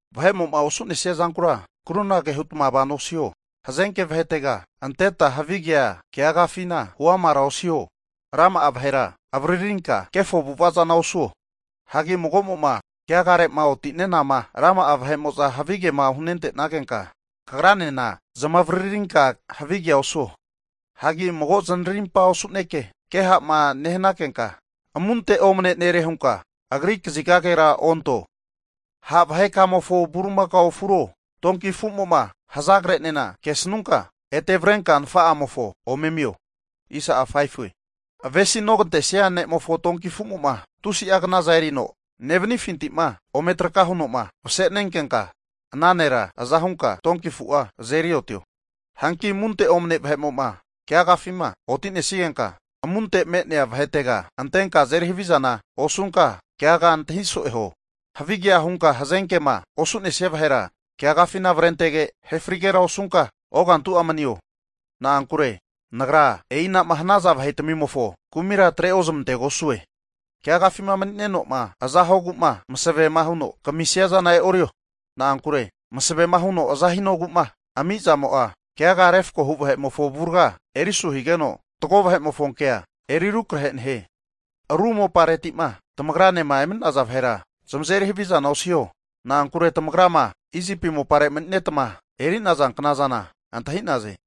Vahe'mo'ma osu'nesiazankura krunagea hutma vano osiho. Hazenke vahetega anteta havi kea keagafina huamara osiho. Rama'a vahera avaririnka kefo avu'ava zana osuo. Hagi mago'mo'ma keagare'ma oti'nenama, rama'a vahe'mo'za havi kema hunente'nagenka kagranena zamavaririnka havi kea osuo. Hanki mago zanarimpa osu'neke ke ha'ma nehanankenka, amunte omane nere hunka agri kazigagera onto. Ha' vahekamofo bulimakao afuro donki afumo'ma hazagre'nena kesnunka, ete avrenka nafa'amofo ome amio. Avesinogantesnia ne'mofo tonki afumo'ma, tusi'a knaza erino nevanifintima ome traka huno'ma masenenkenka, ana nera aza hunka donki afu'a azeri otio. Hanki amunte omne vahe'mo'ma keagafima oti'nesigenka amunte me'nea vahetega antenka azeri havizana osunka keaga antahi so'e huo. Havigea hunka hazenkema osu'nesia vahera keagafina avrentege ahe frigera osunka ogantu'a manio. Na'ankure Nagra e'inama hanaza vahetamimofo kumira atre ozmantegosue. Keagafima mani'neno'ma aza huogu'ma masavema huno kamisia zana e'orio. Na'ankure masavema huno aza hinogu'ma ami zamo'a, keagama refkohu vahe'mofo avurga eri asu higeno, fatgo vahe'mofo kea eri rukrahe nehie. Ru moparetima tamagranema emani'naza vahera zamazeri havi zana osiho. Na'ankure tamagrama Isipi moparema mani'netama eri'naza knazana antahi'naze.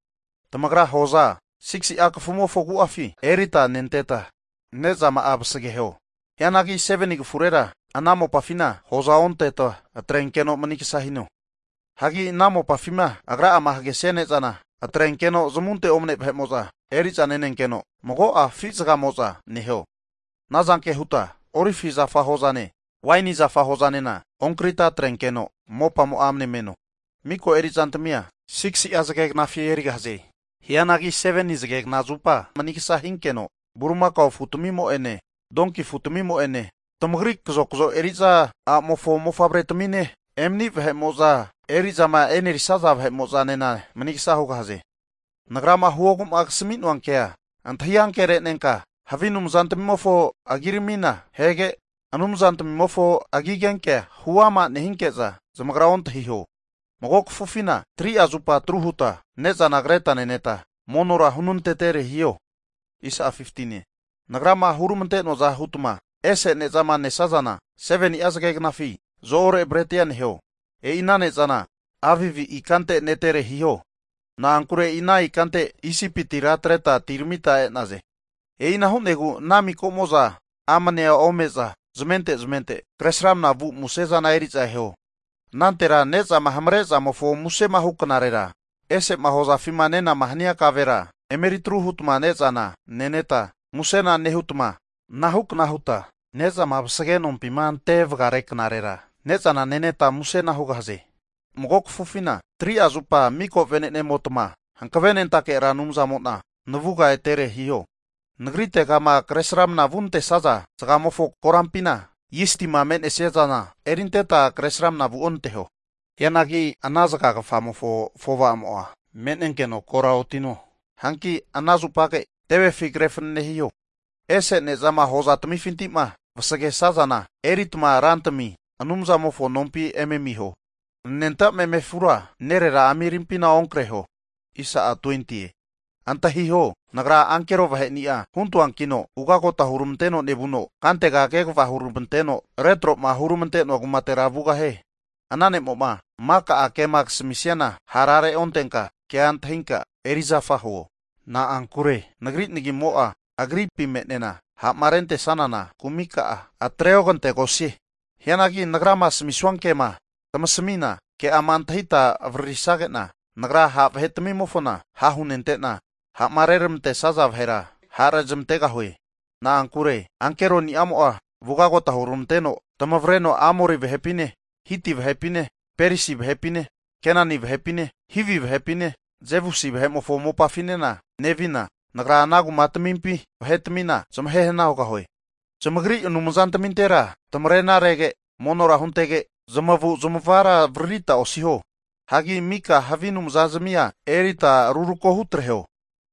Tamagra hoza 6si'a kafumofo agu'afi erita nenteta, ne'zama'a vasageho. Hianagi 7ni kafurera ana mopafina hoza onteta atrenkeno manigsa hino. Hagi ana mopafima agra'ama hagesia ne'zana atrenkeno zamunte omane vahe'mo'za eri'za nenenkeno, mago'a afi zagagafamo'za neho. Ana zanke huta olivi zafa hozane waini zafa hozanena onkrita atrenkeno mopamo'a amne meno. Miko erizantamia 6si'a zage knafi erigahaze. Hianagi 7ni zagekna zupa manigsa hinkeno bulimakao afutamimo'ene donki afutamimo'ene, tamagri kazokzo eri'za a'mofo mofavretamine, emani vahe'mo'zama eri'zama e'nerisaza nena manigsa hugahaze. Nagrama huogu'ma kasami'noa kea antahi ankere'nenka, havi anumazantmimofo agiramina ahege, ana anumzatmimofo agigenke'a huama osiho. Nehinke'za zamagra ontahiho. Mago kafufina 3'a zupa atru huta ne'zana kreta neneta, monora hunantetere hiho. Nagrama hurmante'noaza hutma ese ne'zama nesazana 7ni'a zageknafi zo-ore bretia neho. E'i ana ne'zana Avibi (March-April) ikante netere hiho. Na'ankure e'i ana ikante Isipitira atreta atiramita e'naze. E'ina hu'negu ana mika'mo'za amnea ome'za zamente zamente kresramna vu musezana eri'za eho. Anantera ne'zama hamare'zamofo musema hu knarera, ese'ma hozafima nenama hania kavera emeritru hutma ne'zana neneta musena nehutma, ana hukna huta ne'zama vasage nompima ante vagare knarera, ne'zana neneta musena hugahaze. Mago kafufina 3'a zupa mika venene'motma Hankavenentake Ra Anumzamo'na navuga etere hiho. Nagritegama kresramnama vunantesaza zagamofo koranpina zistima me'nesiazana erinteta Kresramana vuonanteho. Hianagi ana zagagafamofo afovamo'a me'nenkeno kora otino, hanki ana zupage tevefi kre fanane hiho. Ese ne'zama hozatamifinti'ma vasagesazana eritma Rantami Anumzamofo nompi eme amiho. Hagi anenta meme afura nerera ami rimpina onkreho. Antahiho, Nagra ankero vahe'ni'a huntoankino, ugota hurmanteno nevuno kantega kegava huramanteno retro'ma huramante'noa kumatera vugahie. Ana ne'mo'ma mika'a kema kasmisiana, hara reontenka ke'a antahinka erizafa huo. Na'ankure Nagri nagimo'a agripi me'nena, ha'marentesanana kumika'a atreogantegosie. Hianagi Nagrama asamisua kema tamasmi'na ke'ama antahita avaririsage'na, Nagra ha' vahetamimofona ha' hunentena, ha'ma rezmantesaza vahera ha' rezamantegahue. Na'ankure ankeronimo'a ugagota hurmanteno tamavreno Amori vahepine, Hiti vahepine, Perisi vahepine, Kenani vahepine, Hivi vahepine, Jebusi vahe'mofo mopafinena nevina, Nagra ana kumatmimpi vahetmina zmahehana hugahue. Zamagri anumzatmintera tamarenarege monora huntege, zamavu'zmavara avaririta osiho. Hagi mika havi anumzazmia erita rurako hutreho.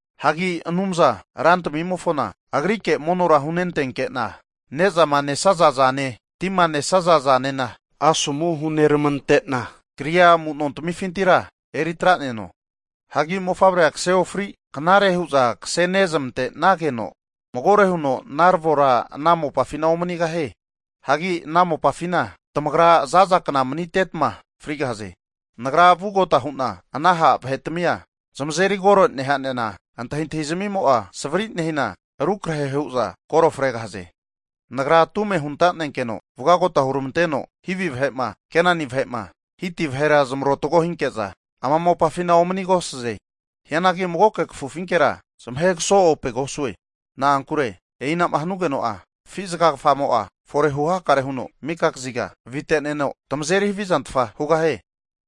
Hagi Anumza Rantamimofona Agrike monora hunentenke'na, ne'zama nesaza zane, tima nesaza zana asomu huneramante'na kria amu'notmifintira eritra'neno. Hagi mofavrea kase ofri knare hu'za kse nezmante'nageno, magore huno naravora ana mopafina omanigahie. Hagi ana mopafina tamagra zaza kna manitetma frigahaze. Nagra vugota hu'na ana ha' vahetimia zamazeri kore neha'nena antahintahi zamimo'a savri nehina rukrahe hu'za kore fregahaze. Nagra tume huntanenkeno ugota hurmanteno Hivi vahe'ma, Kenani vahe'ma, Hiti vahera zmarotago hinke'za ana mopafina omanigosaze. Hianagi magoke kafufinkera zamahe kaso'opegosue, na'ankure e'inama hanugeno'a, afi zagagafamo'a forehu hakare huno mika kaziga avite'neno, tamazeri havizantfa hugahie.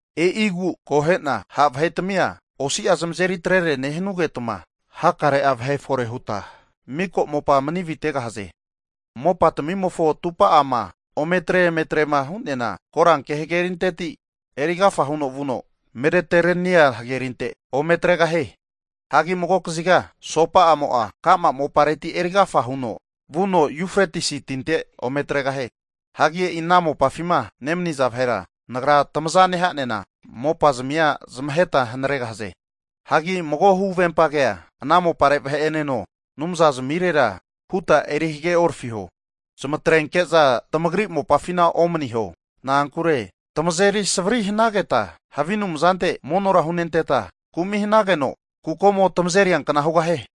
E'igu akohe'na, ha' vahetimia osi'a zamazeri atretere nehanugeta, hakare vahe'ma fore huta miko mopa mani aviteghaze. Mopatimimofo atupa'ama ometre emetrema hu'neana, koranke hgerinteti eri agafa huno vuno Medeterenia hagerinte ome atregahie. Hagi mago kaziga asopa'amo'a ka'ma mopareti erigafa huno vuno Yufretisi tinte ome atregahie. Hagi e'i ana mopafima nemaniza vahera Nagra tamaza nehane'na mopazmia zamaheta hanaregahaze. Hanki mago huvempa kea ana mopare vahe'eneno, anumzazmirera huta eri hageorafiho. Zamatrenke'za tamagri mopafina omaniho. Na'ankure tamazeri savari hanageta havi anumzante monora hunenteta kumi hanageno, kukomo tamazeriankna hugahie.